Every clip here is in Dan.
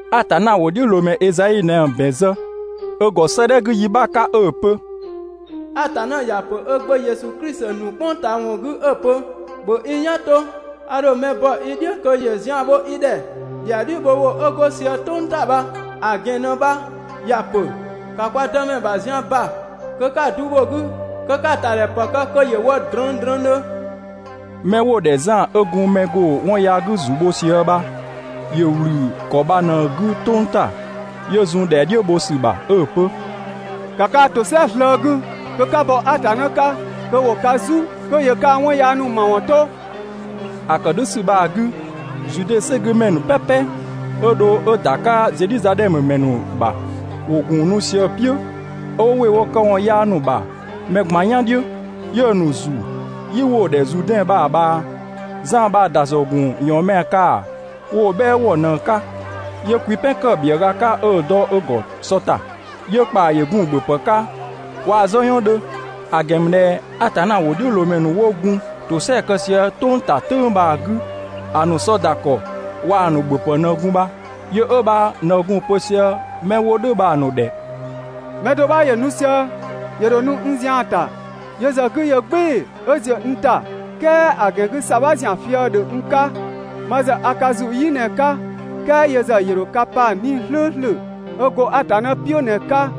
Atanna ‑wʋdhiʋ̈loomɛ Ezai ꞊në‑ ‑bɛn zë ö ‑gɔ 'sëëdhɛ 'gü yi 'bha 'ka 'ö‑ pö: «Atanna ‑ya pö (ö Gbö Yesu Klisi ‑nu "kpʋng ꞊taa ‑wɔn 'gü) 'ö‑ pö: ‑Bhö i "yan 'to, a ‑dho mɛ bɔ i "dhiʋ̈ kö ‑yö zian bho i ‑dhɛ.» ‑Dhɛa "dhiʋ̈ bho ‑wʋ 'ö 'go sië "tʋng ‑ta bha‑ ‑gɛn ꞊në bha ‑ya ‑pö: ‑Ka kwa Dëmɛ ‑bha zian ‑ba kö 'ka‑ du bho‑ 'gü kö 'ka‑ ‑tadhɛ ‑pë kë kö ‑yö wɔ drëngdrëngdhö!» 'Mɛ 'wo‑ ‑dhɛ Zan 'ö gun mɛ ‑go 'wɔn yaa 'gü ‑zu bho sië bha, ‑yö ‑wlü ‑kɔ bha ꞊në‑ 'gü "tʋng ‑ta, 'yö zun ‑dhɛa "dhiʋ̈ bho ‑sü bha 'ö‑ pö: «‑Ka kaa‑ ‑tosɛa slëë‑ 'gü kö 'ka bɔ Atanna 'ka kö ‑wo ka "zu, kö ‑yö kaa‑ 'wɔn yaa ‑nu ‑mawɔn 'to!» ‑A ‑kë "dhʋ̈ ‑sü bha‑ 'gü, Zude ‑sɛgümɛ ‑nu "pɛpɛ, 'ö dho 'ö ‑da 'ka Zedhizadhɛmö ‑mɛ ‑nu ‑bha, ‑wo ‑gun nu sië‑ "piʋ̈, 'ö 'wo ‑wɩ wo këwɔn yaa ‑nu ‑bha mɛ ꞊gban "yan "dhiʋ̈, 'yö‑ ‑nu ‑zu "yi 'wo‑ ‑dhɛ Zuudɛn bha‑ ꞊bhaa. Zan bha‑ ‑dasɔ ‑gun ‑yɔɔnmɛa kaa‑ wo‑ "bhɛɛ ‑wɔ ꞊në‑ 'ka 'yö kwipɛn ‑kë bhiëga 'ka 'ö‑ dɔ ö ‑gɔ sɔ ‑ta, 'yö ‑kpaa ‑yö gun‑ ‑bhöpë 'ka waa‑ "zɔyɔn 'dhö. (‑A ‑gɛn ‑mü ꞊dhɛ Atanna ‑wʋdhiʋ̈loomɛ ‑nu 'wo gun ‑tosɛa kë sië "tʋng ‑ta "tʋ̈ng bha‑ 'gü ‑a ‑nu sɔ ‑da ‑kɔ waa‑ ‑nu ‑bhöpë ꞊në gun bha). Yö 'ö bha ꞊në gun‑ pö sië 'mɛ 'wo nu bha‑ ‑nu ‑dhɛ 'ö‑ pö: «Mɛ do 'bha ‑yö nu sië, ‑yö ‑dho nu n zian‑ ‑ta, yö ‑zë 'gü ‑yö "gbɩɩ‑ 'ö ‑ziö n ‑ta, "kɛɛ ‑a ‑gɛn 'gü ‑sabha ‑zian fië‑ ‑dhö n 'ka. Ma ‑zë a ka ‑zu "yi ꞊në‑ 'ka, "kɛɛ yö ‑zë ‑yö ‑dho ka pa 'Nii‑ "slʋ̈ʋ̈slʋ̈ 'ö go Atanna "piʋ̈ ꞊në‑ 'ka.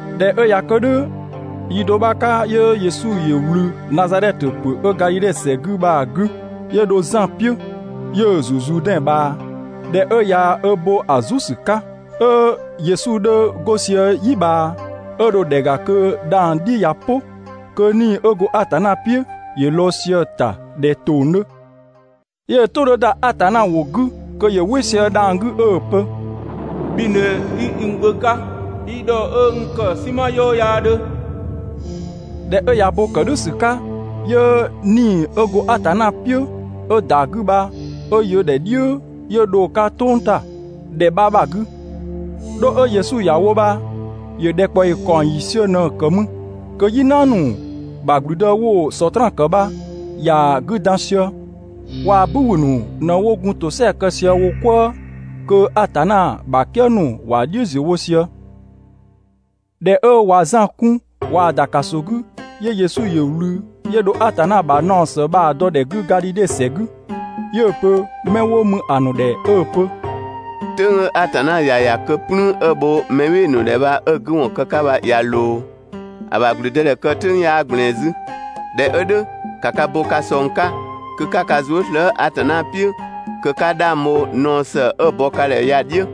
꞊Dhɛ 'ö ꞊ya kë "dhʋ̈, yi do 'bha bha‑ 'ka 'yö Yesu ‑yö ꞊wlü Nazadhɛtö ‑pö 'ö Gadhidhe ‑sɛ 'gü bha‑ 'gü, 'yö dho Zan "piʋ̈, 'yö‑ ‑zu Zuudɛn ꞊bhaa. ꞊Dhɛ 'ö ꞊ya ö bo ‑a "zu ‑sü 'ka, 'ö Yesu 'dhö 'go sië "yi ꞊bhaa, 'ö dho ‑dhɛ ‑ga kö dhang‑ "dhi ꞊ya "pʋ, kö 'Nii‑ 'ö go Atanna "piʋ̈ ‑yö lɔɔ‑ sië‑ ‑ta ꞊dhɛ ‑tong 'dhö. 'Yö‑ "tʋ 'dhö ‑da Atanna ‑wʋ 'gü kö ‑yö "wɩ sië dhang‑ 'gü 'ö‑ pö: «Bhi ꞊në 'i n Gbö 'ka, i ‑dhɔ 'ö n ‑kë "sinma "yɔɔ 'yaa 'dhö.» ꞊Dhɛ 'ö ꞊ya bo ‑kë "dhʋ̈ ‑sü 'ka, 'yö 'Nii‑ 'ö go Atanna "piʋ̈ 'ö ‑da 'gü bha 'ö ‑yö ‑dhɛ "dhiʋ̈ 'yö dho‑ 'ka "tʋng ‑ta (‑dhɛ 'bha bha‑ 'gü). 'Dho 'ö Yesu ‑ya wo bha, ‑yö ‑dhɛkpaɔyi ‑kaɔng ‑yiisiö ꞊në‑ ‑kë mü kö "yina ‑nu ‑bha ‑gblüdë 'wo‑ Sɔtraan ‑kë bha, ‑ya 'gü dan sië. Waa‑ "bü ‑wü ‑nu ꞊në 'wo gun ‑tosɛa kë sië wo "kwëë kö Atanna ‑bha "kië ‑nu ‑wa "dhiʋ̈ ‑ziö wo sië. ꞊Dhɛ 'ö ꞊wa Zan 'kun ꞊waa‑ ‑da ‑kaso 'gü, 'yö Yesu ‑yö ꞊wlü, 'yö dho Atanna ‑bha naɔ ‑së bha‑ dɔ ‑dhɛ 'gü Gadhidhe ‑sɛ 'gü. 'Yö‑ pö 'mɛ 'wo mü ‑a ‑nu ‑dhɛ 'ö‑ pö: «"Tʋ̈ng 'ö Atanna ‑ya ‑ya kö "plüün 'ö‑ bho mɛ "bhɩɩ‑ ‑nu ‑dhɛ bha 'ö‑ 'gü ‑wɔn kë‑ 'ka bha ꞊ya ꞊loo. ‑A ‑bha ‑gblüdëdhɛ kë "tʋ̈ng 'yaa ꞊gblɛɛn 'zü. ꞊Dhɛ 'ö "dhʋ̈, ‑ka ka bo ka ꞊sɔng 'ka kö 'ka ka zuë" slëë‑ Atanna "piʋ̈ kö 'ka 'dhang bho naɔ ‑së 'ö‑ bɔ ka ‑dhɛ ya‑ "dhiʋ̈!»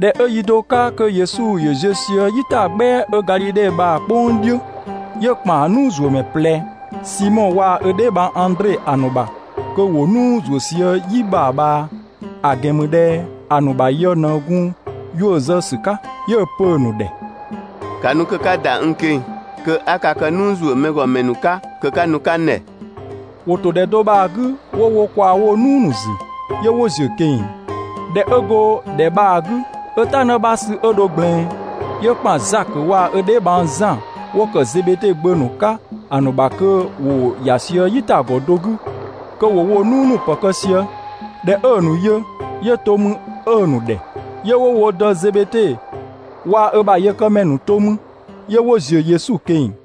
꞊Dhɛ 'ö yi do 'ka kö Yesu ‑yö ziö sië "yitagbɛa 'ö Gadhidhe bha‑ "kpʋng "dhiʋ̈, 'yö ‑kpan "nuuzuömɛ ꞊plɛ, Simɔ waa‑ ö dheebhang Andre ‑a ‑nu ‑bha kö ‑wo "nuu ‑zuö sië "yi bha‑ ꞊bhaa, ‑a ‑gɛn ‑mü ꞊dhɛ ‑a ‑nu ‑bha yë ꞊në gun 'yuʋ̈‑ zë ‑sü 'ka. 'Yö‑ pö‑ ‑nu ‑dhɛ: «‑Ka nu kö 'ka ‑da n ꞊keng‑ kö 'a ka kë "nuu ‑zuö mɛ ‑gɔ ‑mɛ ‑nu 'ka kö 'ka nu‑ 'ka n ‑dhɛ!» ‑Wo ‑to ‑dhɛ do bha‑ 'gü 'wo wo ꞊kwaa woo‑ "nuu ‑nu ‑zü, 'yö 'wo ‑ziö ꞊keng‑. ꞊Dhɛ 'ö go ‑dhɛ bha‑ 'gü 'ö "ta 'në 'bha sü 'ö dho ꞊gblɛɛn, 'yö ‑kpan Zakö waa‑ ö dheebhang Zan 'wo ‑kë Zebede gbö ‑nu 'ka ‑a ‑nu ‑bha kö ‑wo ‑ya sië "yitagɔ do 'gü kö ‑wo woo‑ "nuu ‑nu ‑pë kë sië. ꞊Dhɛ 'ö‑ ‑nu yö, 'yö to mü 'ö‑ ‑nu ‑dhɛ, 'yö 'wo wo dë Zebede waa‑ ö ‑bha yëkëmɛ ‑nu to 'mü, 'yö 'wo ‑ziö Yesu ꞊keng‑.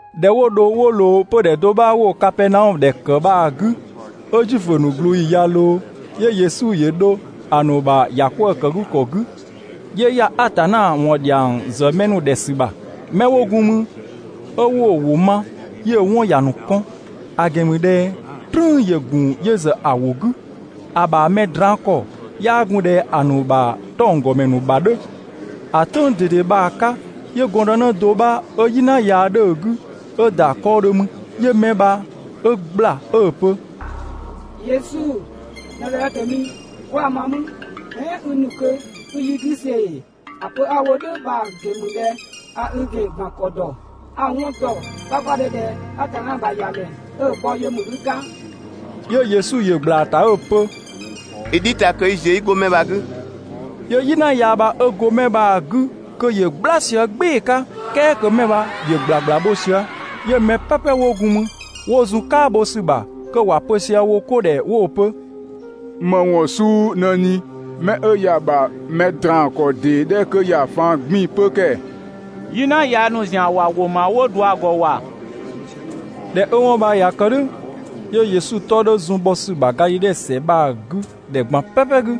꞊Dhɛ 'wo dho 'wo ꞊loo 'pödhɛ do 'bha 'wo‑ Kapɛɛnaɔmö ‑dhɛ ‑kë bha‑ 'gü, 'ö Zuifö ‑nu ꞊glooyi ꞊ya ꞊loo, 'yö Yesu ‑yö dho ‑a ‑nu ‑bha ‑yakwëëkëgükɔ 'gü, 'yö ‑ya Atanna ‑wɔn ‑dhiang ‑zë mɛ ‑nu ‑dhɛ ‑sü ‑bha. 'Mɛ 'wo gun mü, 'ö 'wo‑ ‑wʋ ma, 'yö‑ 'wɔn ‑ya ‑nu kɔn, ‑a ‑gɛn ‑mü ꞊dhɛ "trüün ‑yö ‑gun yö ‑zë ‑a ‑wʋ 'gü, ‑a ‑bha mɛ draan‑ ‑kɔ 'yaa gun ꞊dhɛ ‑a ‑nu ‑bha 'tɔnggɔmɛ ‑nu ‑bha 'dhö. ‑A "tʋ̈ng ꞊dede bha‑ 'ka 'yö gɔndënë do 'bha 'ö "yina yaa 'dhö‑ 'gü 'ö ‑da 'kɔɔdhö mü. 'Yö 'mɛ bha 'ö ꞊gbla 'ö‑ pö: «Yesu, Nazadhɛtö mi, 'kwa‑ ma mü? "Ɛɛn i ‑nu kö 'i yi 'gü see‑ ‑ee? ‑A pö 'a‑ wo "dhʋ̈ bha‑ ‑gɛn ‑mü ꞊dhɛ a i ‑gɛn ‑gban ‑kɔ ‑dɔ. A‑ 'wɔn ‑dɔ 'kpakpadhö ꞊dhɛ Atanna ‑bha ‑Yamɛ 'ö‑ bɔ yö ‑mü i 'ka!» 'Yö Yesu ‑yö ꞊gbla‑ ‑ta 'ö‑ pö: «I "dhi ta kö 'i ziö 'i 'go 'mɛ bha‑ 'gü!» 'Yö "yina yaa bha 'ö go 'mɛ bha‑ 'gü kö ‑yö "gbla sië "gbɩɩ‑ 'ka, "kɛɛ kö 'mɛ bha ‑yö ‑gblagbla bho sië. 'Yö mɛ "pɛpɛ 'wo gun mü, 'wo zun "kaabho ‑sü bha kö ‑wa pö sië wo 'ko ‑dhɛ 'wo‑ pö: «‑Më ‑wɔn suu ꞊në ꞊ni ‑oo? Mɛ 'ö ya‑ ‑bha mɛ draan‑ ‑kɔ ‑dee 'dhɛ 'kö ya‑ faan‑ 'gbiin‑ 'pö ‑kɛɛ! "Yina yaa ‑nu ‑zian ‑wa ‑wʋ ‑ma 'wo ꞊dua‑ ‑gɔ ‑wa!» ꞊Dhɛ 'ö 'wɔn bha ꞊ya kë "dhʋ̈, 'yö Yesu 'tɔ 'dhö zun‑ bhɔ ‑sü ‑bha Gadhidhe ‑sɛ bha‑ 'gü ‑dhɛ ꞊gban "pɛpɛ 'gü.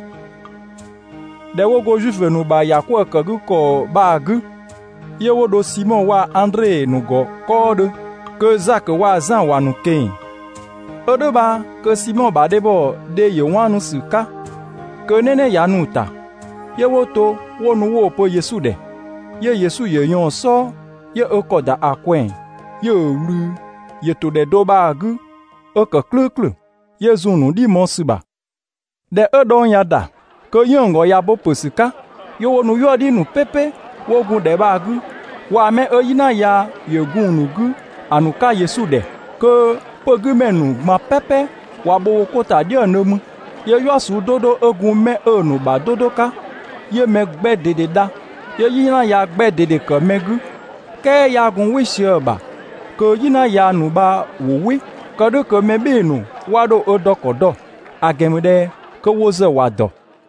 ꞊Dhɛ 'wo go Zuifö ‑nu ‑bha ‑yakwëëkëgükɔ bha‑ 'gü, 'yö 'wo dho Simɔ waa‑ Andre ‑nu ‑gɔ 'kɔɔdhö kö Zakö waa‑ Zan ‑wa ‑nu ꞊keng‑. 'Ö "dhʋ̈ bha kö Simɔ ‑bha dhebhɔ dhe ‑yö 'waanu ‑sü 'ka, kö "nɛnɛ ꞊ya nu‑s‑ta, 'yö 'wo to 'wo nu 'wo‑ pö Yesu ‑dhɛ. 'Yö Yesu ‑yö ꞊yɔɔn‑ "sɔɔ, 'yö ö ‑kɔ ‑da ‑a ꞊kwɛɛ‑, 'yö‑ ꞊wlü, ‑yö ‑to ‑dhɛ do bha‑ 'gü 'ö ‑kë "klʋ̈ʋ̈klʋ̈, 'yö zun‑ ‑nu "dhi mɔɔ‑ ‑sü ‑bha. ꞊Dhɛ 'ö dhɔng ꞊ya ‑da, kö 'yënng‑ ‑gɔ ꞊ya bo ‑pö ‑sü 'ka, 'yö 'wo nu "yuëdhi ‑nu "pɛpɛ 'wo gun ‑dhɛ bha‑ 'gü waa‑ 'mɛ 'ö "yina yaa ‑yö gun‑ ‑nu 'gü ‑a ‑nu 'ka Yesu ‑dhɛ. Kö 'pögümɛ ‑nu ꞊gban "pɛpɛ ꞊wa bho 'ko ‑ta "dhiëngdhö mü. 'Yö "yua suu 'do 'do 'ö gun 'mɛ ‑a ‑nu ‑bha 'do 'do 'ka, 'yö‑ mɛ 'gbɛ ꞊dede dha, 'yö "yina yaa 'gbɛ ꞊dede ‑kë mɛ 'gü, "kɛɛ 'yaa gun "wɩ sië‑ ‑bha kö "yina yaa ‑nu bha ‑wo "wɩ, kë "dhʋ̈ kö mɛ "bhɩɩ‑ ‑nu 'wa 'dho ö dɔ ‑kɔ dɔ, ‑a ‑gɛn ‑mü ꞊dhɛ kö wo ‑zë ‑wa ‑dɔ.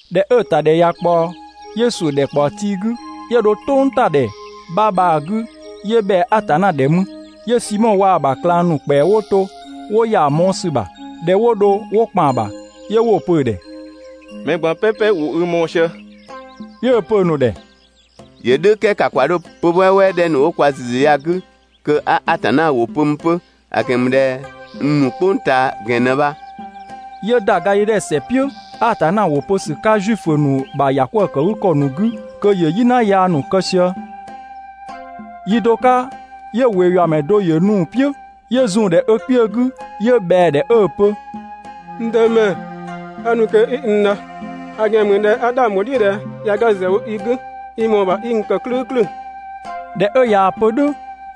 ꞊Dhɛ 'ö‑ ‑tadhɛ ꞊ya ꞊kpaɔ, 'yö ‑suʋ̈ ‑dhɛkpaɔ tii 'gü, 'yö dho "tʋngtadhɛ 'bha bha‑ 'gü 'yö ꞊bhɛa Atanna ‑dhɛ mü. 'Yö Simɔ waa‑ ‑bha ꞊klang ‑nu ‑kpɛa 'wo to 'wo ‑ya ‑a mɔɔ‑ ‑sü ‑bha. ꞊Dhɛ 'wo dho 'wo ‑kpan ‑bha, 'yö 'wo‑ pö‑ ‑dhɛ: «Mɛ ꞊gban "pɛpɛ ‑wo i mɔɔ‑ sië.» 'Yö‑ pö‑ ‑nu ‑dhɛ: «‑Yö "dhʋ̈ "kɛɛ ‑ka ‑kwa 'dho 'pö‑ "wɛɛwɛɛ 'dhɛ ‑nu 'wo kwa ‑züzü ya‑ 'gü kö 'a Atanna ‑wʋ pö 'mü 'pö, ‑a ‑gɛn ‑mü ꞊dhɛ n ‑nu "kpʋng ꞊taa ‑gɛn ꞊në bha.» 'Yö ‑da Gadhidhe ‑sɛ "piʋ̈ Atanna ‑wʋ pö ‑sü 'ka Zuifö ‑nu ‑bha ‑yakwëëkëgükɔ ‑nu 'gü kö ‑yö "yina yaa ‑nu kë sië. Yi do 'ka 'yö ꞊weeyuamɛ do ‑yö nu‑ "piʋ̈, 'yö zun‑ ‑dhɛ ö kpiö 'gü, 'yö ꞊bhɛa‑ ‑dhɛ 'ö‑ pö: «N Dëmɛ, a ‑nu kö 'i n dha, ‑a ‑gɛn ‑mü ꞊dhɛ a 'dhang ‑bho "dhiʋ̈ ꞊dhɛ ꞊ya ga ‑zë wo i 'gü, i ‑mɔɔ ‑bha 'i n ‑kë "klʋ̈ʋ̈klʋ̈!» ꞊Dhɛ 'ö ꞊yaa‑ pö "dhʋ̈,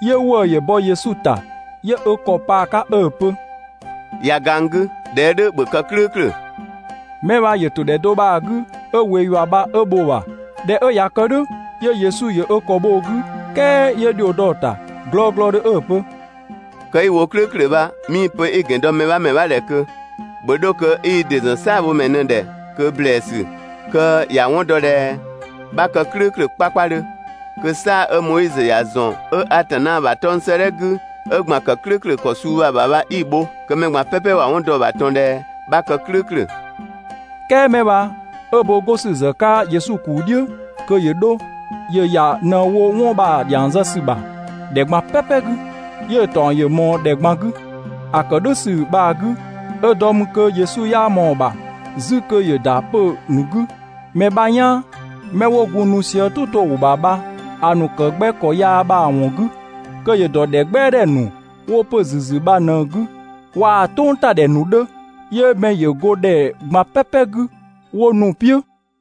'yö ‑wëë ‑yö bɔ Yesu ‑ta, 'yö ö ‑kɔ pa‑ 'ka 'ö‑ pö: «꞊Ya ga n 'gü, ꞊dhɛ 'ö "dhʋ̈, ‑bhö kë "klʋ̈ʋ̈klʋ̈!» Mɛ bha ‑yö ‑to ‑dhɛ do bha‑ 'gü 'ö ꞊wee ‑yua bha 'ö bho‑ ‑bha. ꞊Dhɛ 'ö ꞊ya kë "dhʋ̈, 'yö Yesu ‑yö ö ‑kɔ bho‑ 'gü, "kɛɛ 'yö ‑dhio dɔ‑ ‑ta glɔglɔdhö 'ö‑ pö: «Kë 'i‑ wo "klʋ̈ʋ̈klʋ̈ bha, 'mii‑ pö 'i‑ ‑gɛn dɔ mɛ 'bha ‑mɛ 'bha ‑dhɛ ꞊kö, ‑bhö 'dho kö 'i i ‑dɩ ‑zɔn "saabhomɛ ꞊në‑ ‑dhɛ ꞊kö ‑blɛɛsü kö ‑ya 'wɔn dɔ ꞊dhɛ 'bha kë "klʋ̈ʋ̈klʋ̈ 'kpakpadhö, kö "saa‑ 'ö Moizö ‑ya ‑zɔn 'ö Atanna ‑bha 'tɔng‑ 'sëëdhɛ 'gü 'ö ‑gban ‑kë "klʋ̈ʋ̈klʋ̈ ‑kɔ suu bha‑ ‑bha bha 'i‑ bho kö mɛ ꞊gban "pɛpɛ ‑wa 'wɔn dɔ‑ ‑bha ꞊tɔn ꞊dhɛ 'bha kë "klʋ̈ʋ̈klʋ̈.» "Kɛɛ 'mɛ bha 'ö bo 'go ‑sü ‑zë 'ka Yesu ‑kuu "dhiʋ̈ kö ‑yö 'dho, ‑yö ‑ya ꞊në‑ wo 'wɔn bha‑ ‑dhiang zë ‑sü ‑bha ‑dhɛ ꞊gban "pɛpɛ 'gü, 'yö‑ ‑taɔng ‑yö ꞊mɔɔ ‑dhɛ ꞊gban 'gü. ‑A ‑kë "dhʋ̈ ‑sü bha‑ 'gü, 'ö dɔ mü kö Yesu 'yaa ꞊mɔɔ‑ ‑bha 'zü kö ‑yö ‑da 'pö‑ ‑nu 'gü mɛ 'bha "yaan ('mɛ 'wo gun nu sië "tʋ to‑ ‑wʋ ‑bha bha‑ ‑nu ‑kë 'gbɛ ‑kɔ yaa bha‑ ‑wɔn 'gü), kö ‑yö ‑dɔ ‑dhɛ "gbɛadhɛ ‑nu 'wo 'pö‑ ‑züzü bha ꞊në‑ 'gü, waa‑ "tʋngtadhɛ ‑nu 'dhö, 'yö mɛ ‑yö go ‑dhɛ ꞊gban "pɛpɛ 'gü 'wo nu‑ "piʋ̈.